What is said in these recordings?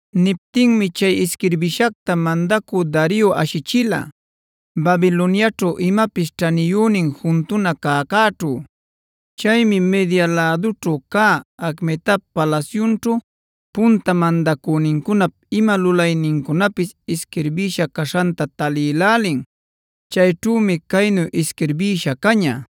Niptinmi chay isquirbishacta mandacü Dario ashichila Babiloniaćhu imapis ćhaniyünin juntuna cäcäćhu. Chaymi Media lädućhu cä Acmetap palasyunćhu punta mandacünincunap ima lulaynincunapis isquirbisha caśhanta talïlälin. Chayćhümi caynu isquirbïsha caña: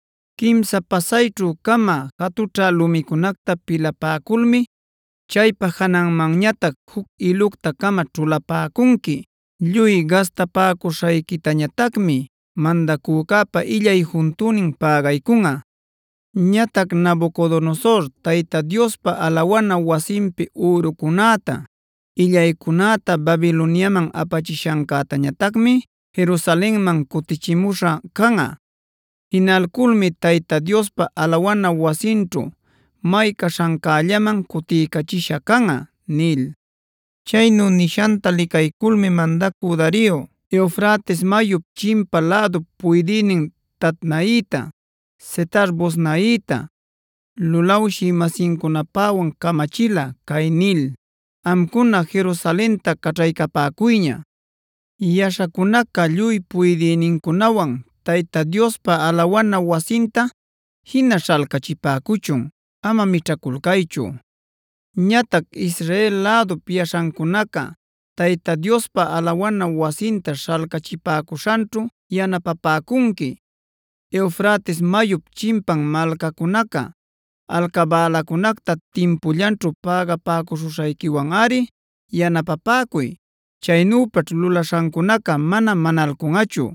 Quimsa pasayćhu-cama jatućhä lumicunacta pilapäculmi chaypa jananmanñatac juc ilucta-cama ćhulapäcunqui. Lluy gastapäcuśhayquitañatacmi mandacücäpa illay juntünin pägaycunꞌa. Ñatac Nabucodonosor Tayta Diospa alawana wasinpi ürucunäta, illaycunäta Babiloniaman apachishancäñatacmi Jerusalenman cutichimuśha canꞌa. Jinaculmi Tayta Diospa alawana wasinćhu may caśhancällaman cutiycachisha canꞌa’” nil. Chaynu nishanta licayculmi mandacü Dario Eufrates mayup chimpa lädup puydïnin Tatnaita, Setar-boznaita, lulawshï-masincunapäwan camachila cay nil: “Amcuná, Jerusalenta caćhaycapäcuyña. Yaśhacunaca lluy puydïnincunawana Tayta Diospa alawana wasinta jina śhalcachipäcuchun. Ama mićhaculcaychu. Ñatac Israel lädup yaśhancunaca Tayta Diospa alawana wasinta śhalcachipäcuśhanćhu yanapapäcunqui. Eufrates mayup chimpan malcacunaca alcabälacunacta timpullanćhu pägapäcuśhayquiwanꞌari yanapapäcuy. Chaynüpaćh lulaśhancunaca mana manalcunꞌachu.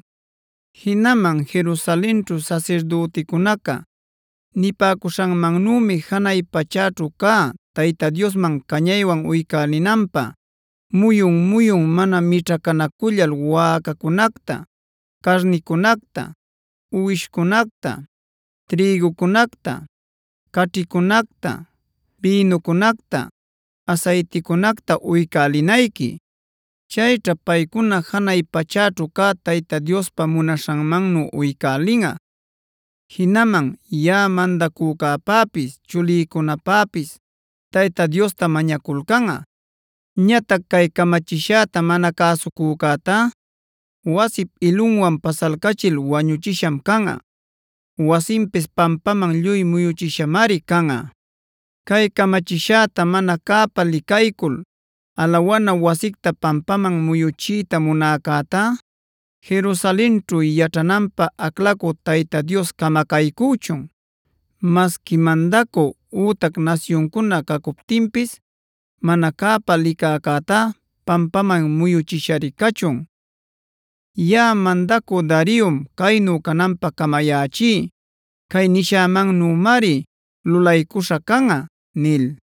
Jinaman Jerusalenćhu sasirdüticunaca nipäcuśhanmannümi janay pachäćhu cä Tayta Diosman cañaywan uycälinanpä muyun-muyun mana mićhacänacullal wäcacunacta, carnicunacta, uwishcunacta, trïgucunacta, caćhicunacta, bïnucunacta, asayticunacta uycälinayqui. Chayćha paycuna janay pachäćhu cä Tayta Diospa munaśhanmannu uycälinꞌa, jinaman yaꞌa mandacücäpäpis chulïcunapäpis Tayta Diosta mañaculcanꞌa. Ñatac cay camachishäta mana cäsucücätá wasip ilunwan pasalcachil wañuchisham canꞌa. Wasinpis pampaman lluy muyuchishamari canꞌa. Cay camachishäta mana cäpa licaycul alawana wasicta pampaman muyuchiyta munäcätá, Jerusalenćhu yaćhananpä aclacü Tayta Dios camacaycüchun. Masqui mandacü ütac nasyuncuna cacuptinpis mana cäpa licäcätá pampaman muyuchishari cachun. Yaꞌa mandacü Dariom caynu cananpä camayächí. Cay nishämannümari lulaycuśha canꞌa” nil.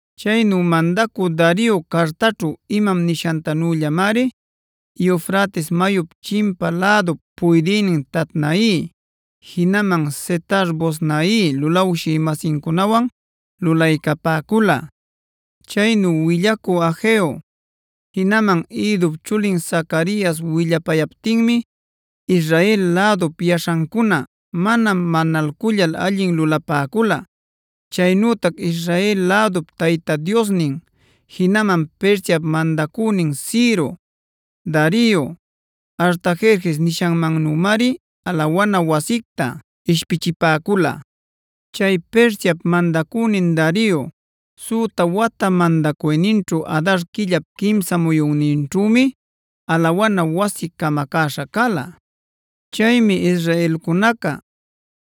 Chaynu mandacü Dario cartaćhu imam nishantanüllamari Eufrates mayup chimpa lädup puydïnin Tatnai, jinaman Setar-boznai lulawshï-masincunawan lulaycapäcula. Chaynu willacü Hageo, jinaman Iddop chulin Zacarias willapayaptinmi Israel lädup yaśhancuna mana manalcullal allin lulapäcula.b Chaynütac Israel lädup Tayta Diosnin, jinaman Persiap mandacünin Ciro, Dario, Artajerjes nishanmannümari alawana wasicta ishpichipäcula. Chay Persiap mandacünin Dario süta wata mandacuyninćhu Adar quillap quimsa muyunninćhümi alawana wasi camacäśha cala. Chaymi israelcunaca,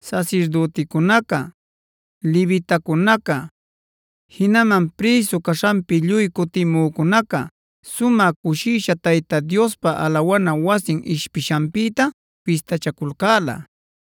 sasirdüticunaca, levitacunaca, jinaman prïsu caśhanpi lluy cutimücunaca sumä cushisha Tayta Diospa alawana wasin ishpishanpïta fistachaculcäla.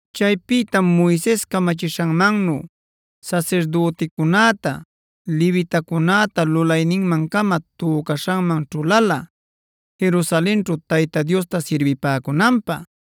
Chaypïtam Moises camachishanmannu sasirdüticunäta, levitacunäta lulayninman-cama tücaśhanman ćhulala Jerusalenćhu Tayta Diosta sirbipäcunanpä.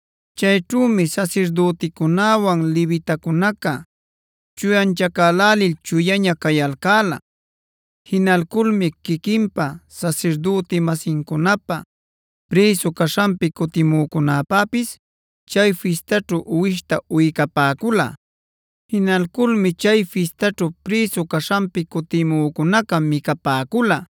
Chayćhümi sasirdüticunäwan levitacunaca chuyanchacälälil chuyaña cayalcäla. Jinalculmi quiquinpä, sasirdüti-masincunapä, prïsu caśhanpi cutimücunäpäpis chay fistaćhu uwishta uycapäcula. Jinalculmi chay fistaćhu prïsu caśhanpi cutimücunaca micapäcula.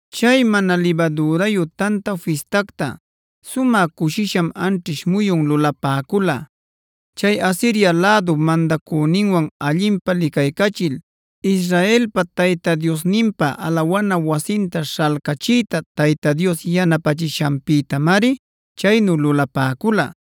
Chay Mana Libadürayu Tanta Fistacta sumä cushisham anćhish muyun lulapäcula. Chay Asiria lädup mandacüninwan allinpä licaycachil, Israelpa Tayta Diosninpa alawana wasinta śhalcachiyta Tayta Dios yanapächishanpïtamari chaynu lulapäcula.